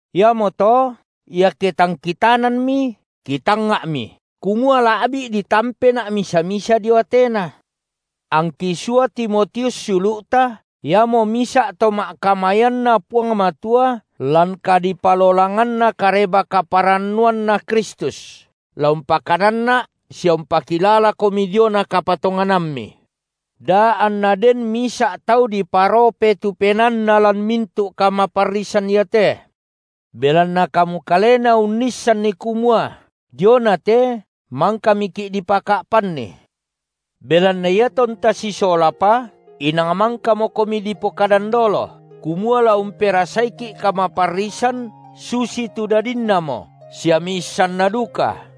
Iamoto iake tang kitananmi, kitangnga’mi, kumua la’bi’ ditampena’ misa-misa dio Atena. Angki sua Timotius siulu’ta, iamo misa’ to ma’kamayanNa Puang Matua lan kadipalolanganna Kareba-kaparannuanNa Kristus, la umpakananna’ sia umpakilalakomi diona kapatonganammi, da anna den misa’ tau diparope tu penaanna lan mintu’ kamaparrisan iate. Belanna kamu kalena unnissanni kumua diona te mangkamiki’ dipaka’panni. Belanna iatonta sisolapa, inang mangkamokomi kipokadan dolo, kumua la umperasaiki’ kamaparrisan, susitu dadinnamo sia miissanna duka.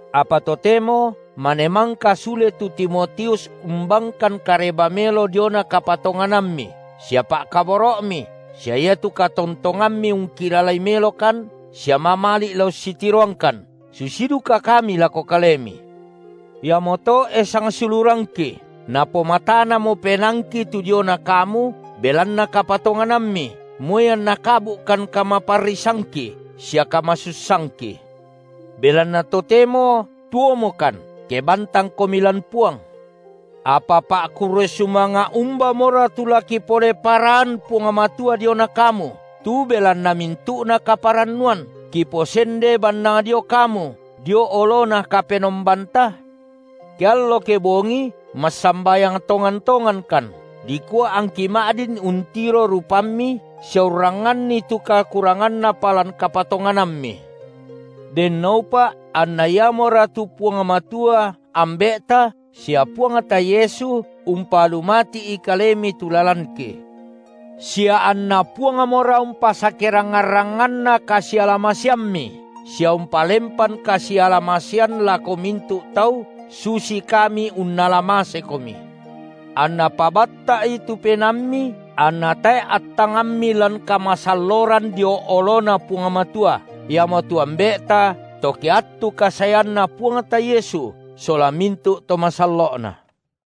Apa totemo mane mangka sule tu Timotius umbangkan kareba melo diona kapatonganammi sia pa’kaboro’mi sia iatu katontongammi ungkilalai melokan sia mamali’ la ussitiroangkan, susi duka kami lako kalemi. Iamoto, e sangsiulurangki, napomatanamo penaangki tu diona kamu belanna kapatonganammi, moi anna kabu’kan kamaparrisangki sia kama- sussangki. Belanna totemo tuomokan, ke bantangkomi lan Puang. Apa pa’kurre sumanga’ umbamora tu la kipole paraan Puang Matua diona kamu, tu belanna mintu’na kaparannuan, kiposende bannang dio kamu dio oloNa Kapenombanta? Keallo kebongi massambayang tongan-tongankan, dikua angki ma’din untiro rupammi sia urrangnganni tu kurangnapa lan kapatonganammi. Dennoupa’ anNa Iamora, tu Puang Matua Ambe’ta sia Puangta Yesu umpalumati’i kalemi tu lalanki. Sia anNa Puangmora umpasake- rangngan-rangnganna kasiala-maseammi sia umpalempan kasiala-masean lako mintu’ tau susi kami unnala mase- komi. AnNa pabatta’i tu penaammi, anna tae’ attangammi lan kamasalloran dio oloNa Puang Matua, Iamotu Ambe’ta, to ke attu kasaeanNa Puangta Yesu sola mintu’ to masallo’Na.